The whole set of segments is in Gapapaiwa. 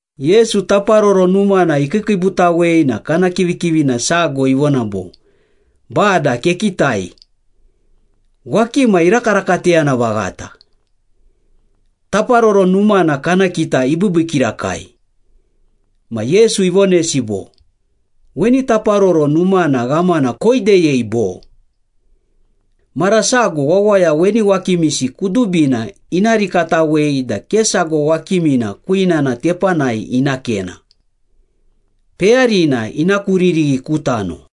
Yesu Taparoro Numana ikiikiibutawei na kana kivikivina sago ivona bo, “Bada, kekitai. Wakima irakarakateyana vaghata! Taparoro Numana kana kita ibiibii kirakai!” Ma Yesu ivonesi bo, “Weni Taparoro Numana ghamana koideyei, bo? Mara sago wawaya weni wakimisi kudubina ina rikatawei da ke sago wakimina kwinana tepanai ina kena. Peyarina ina kuririghi ku tano.”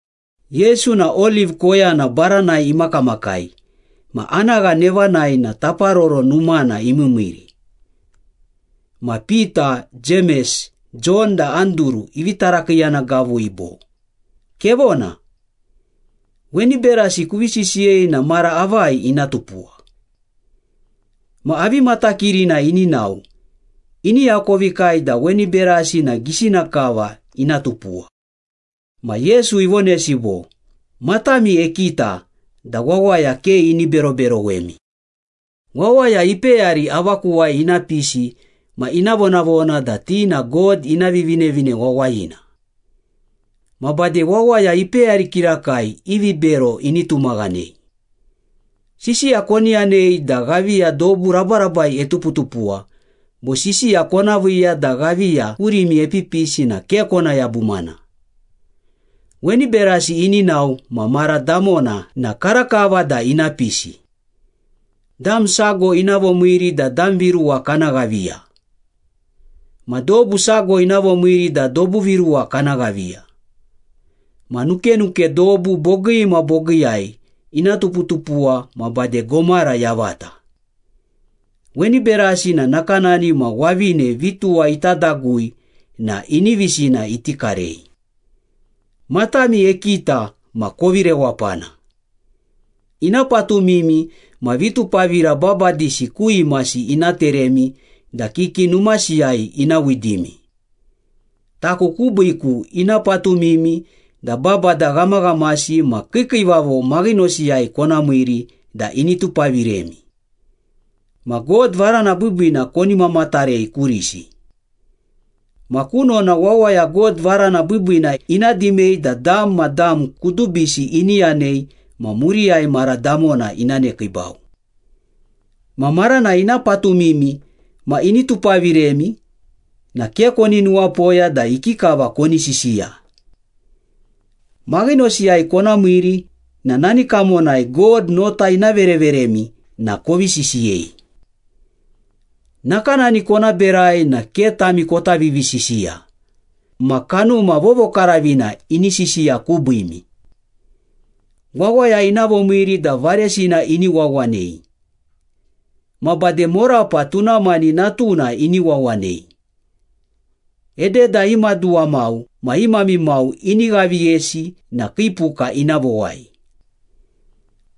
Yesu na Oliv koyana baranai imakamakai ma anagha nevanai na Taparoro Numana imiimiiri. Ma Pita, Jemes, Jon da Anduru ivi tarakiiyana gavui bo, “Kevona. Weni berasi kuvi sisiyei na mara avai ina tupuwa? Ma avi matakirina ini nao, ini akovikai da weni berasi na gisina kava ina tupuwa?” Ma Yesu ivonesi bo, “Matami ekita da wawaya ke ini beroberowemi. Wawaya ipeyari avakuwai ina pisi ma ina vonavona da ti na God ina Vivinevine Wawayina. Ma bade wawaya ipeyari kirakai i vibero ini tumaghanei. Sisiya koni yanei da ghaviya dobu rabarabai etuputupuwa bo sisiya kona viiya da ghaviya kurimi epipisi na ke kona yabumana. Weni berasi ini nao ma mara damona na karakava da ina pisi. Dam sago ina vomiiri da dam viruwa kana ghaviya. Ma dobu sago ina vomiiri da dobu viruwa kana ghaviya. Ma nukenuke dobu bogii ma bogiiyai ina tuputupuwa ma bade gomara yavata. Weni berasi na nakanani ma wavine vituwa ita dagui na inivisina iti karei.” “Matami ekita ma kovi rewapana. Ina patumimi ma vitupavira babadisi ku imasi ina teremi da kiki numasiyai ina widimi. Taku kubiiku ina patumimi da babada ghamaghamasi ma kiikiivavo maghinosiyai kona miiri da ini tupaviremi. Ma God varana biibiina koni mamatarei kurisi. Ma kunona wawaya God varana biibiina ina dimei da dam ma dam kudubisi ini yanei ma muriyai mara damona ina nekiibau. Ma maranai ina patumimi ma ini tupaviremi na ke koni nuwapoya da ikikava koni sisiya. Maghinosiyai kona miiri na nani kamonai God nota ina vereveremi na kovi sisiyei. Nakanani kona berai na ke tami kota vivisisiya, ma Kanuma Vovokaravina ini sisiya kubiimi. Wawaya ina vomiiri da varesina ini wawanei. Ma bade morapa tuna mani natuna ini wawanei. Ededa i maduwa mau ma i mami mau ini ghaviyesi na kii puka ina vowai.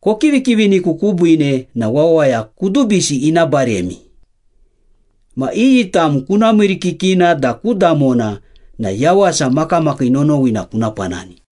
Kokivikiviniku kubiine na wawaya kudubisi ina baremi. Ma iyi tam kuna miirikikina da ku damona na yawasa makamakii nonowina kuna panani.”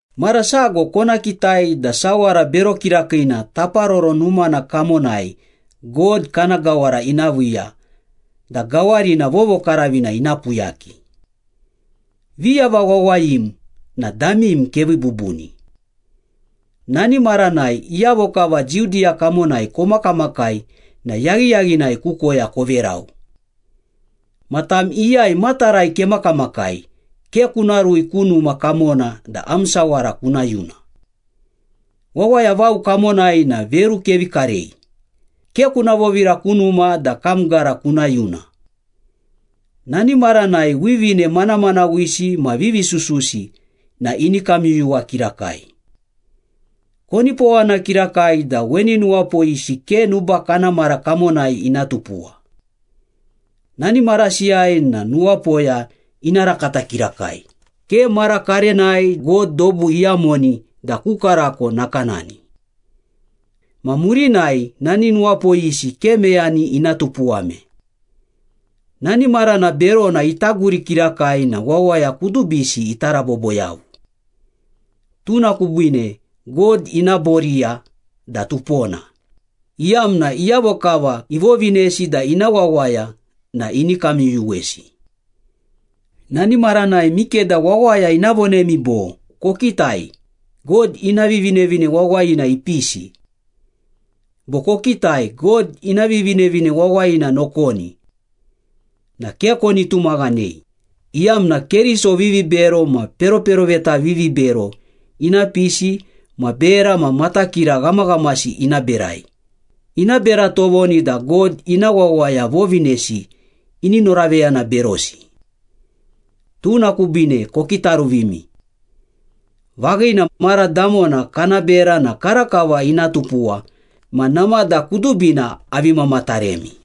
“Mara sago kona kitai da ‘Sawara Bero Kirakiina’ Taparoro Numana kamonai God kana gawara ina viiya da gawarina vovokaravina ina puyaki.” (Viyava wawayim na damim kevii bubuni.) “Nani maranai iyavo kava Judiya kamonai komakamakai na yaghiyaghinai ku koya koverau. Ma tam iyai matarai kemakamakai ke kuna rui ku numa kamona da am sawara kuna yuna. Wawaya vao kamonai na veru kevi karei, ke kuna vovira ku numa da kam gara kuna yuna. Nani maranai wivine manamanawisi ma vivisususi na ini kamyuyuwa kirakai. Konipowana kirakai da weni nuwapoyisi ke nuba kana mara kamonai ina tupuwa. Nani marasiyai na nuwapoya ina rakata kirakai, ke mara karenai God dobu iyamoni da ku karako nakanani. Ma murinai nani nuwapoyisi ke meyani ina tupuwame. Nani marana berona ita guri kirakai na wawaya kudubisi ita rabobo yavu. Tuna kubiine God ina boriya da tupona, iyamna iyavo kava ivovinesi da ina wawaya na ini kamyuyuwesi.” “Nani maranai mikeda wawaya ina vonemi bo, ‘Kokitai, God ina Vivinevine Wawayina ipisi!’ bo ‘Kokitai, God ina Vivinevine Wawayina nokoni!’ na ke koni tumaghanei, iyamna Keriso vivibero ma peroperoveta vivibero ina pisi ma bera ma matakira ghamaghamasi ina berai, ina bera tovoni da God ina wawaya vovinesi ini noraveyana berosi. Tuna kubiine kokitaruvimi. Vaghina, mara damona kana bera na karakava ina tupuwa ma namada kudubina avi mamataremi.”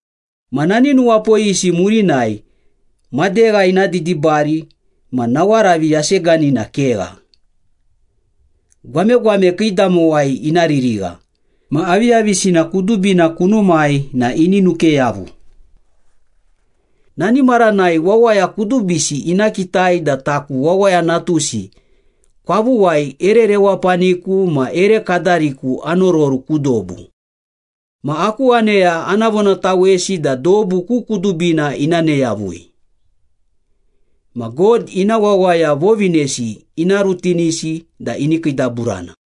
“Ma nani nuwapoyisi murinai, ‘Madegha ina didibari ma nawaravi yaseganina kegha. Gwamegwame kiidamowai ina ririgha, ma aviyavisina kudubina kunumai na ini nuke yavu.’ Nani maranai wawaya kudubisi ina kitai da taku Wawaya Natusi kwavuwai ere rewapaniku ma ere kadariku anororu ku dobu. Ma aku aneya ana vonatawesi da dobu ku kudubina ina ne yavui. Ma God ina wawaya vovinesi ina rutinisi da ini kiidaburana.”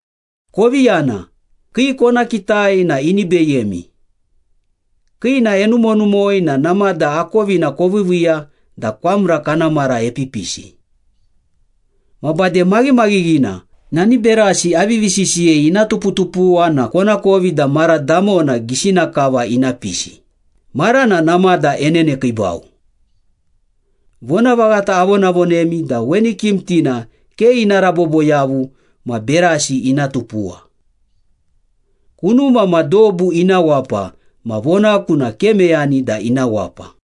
“Kovi yana, kii kona kitai na ini beyemi. Kiina enumonumoi na namada akovina koviiviiya da kwamra kana mara epipisi. Ma bade maghimaghighina, nani berasi avivi sisiyei ina tuputupuwa na konakovi da mara damona gisina kava ina pisi, marana namada enenekiibau. Vonavaghata avonavonemi da weni kimitina ke ina rabobo yavu ma berasi ina tupuwa. Kunuma ma dobu ina wapa ma vonaku na ke meyani da ina wapa.”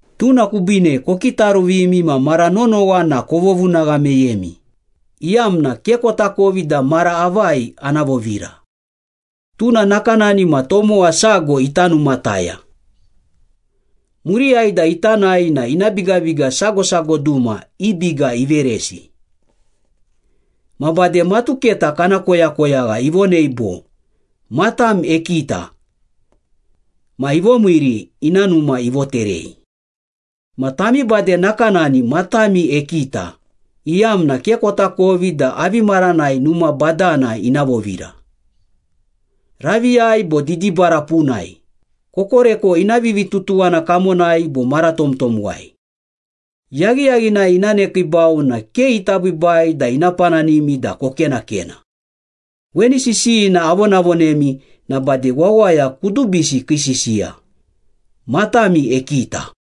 Tuna kubiine kokitaruvimi ma mara nonowa na kovovunagha meyemi, iyamna ke kotakovi da mara avai ana vovira. Tuna nakanani ma tomowa sago ita numataya. Muriyai da ita nae na ina bigabiga sago sago duma i biga iveresi. Ma bade matuketa kana koyakoyagha ivonei bo, ‘Matam ekita.’ Ma ivomiiri, ina numa ivoterei. Ma tami bade nakanani, matami ekita, iyamna ke kotakovi da avi maranai numa badana ina vovira. Raviyai bo didibara punai, kokoreko ina vivitutuwana kamonai bo mara tomtomwai. Yaghiyaghinai ina nekiibau na ke ita biibai da ina pananimi da kokenakena. Weni sisiyina avonavonemi na bade wawaya kudubisi kii sisiya. ‘Matami ekita.’”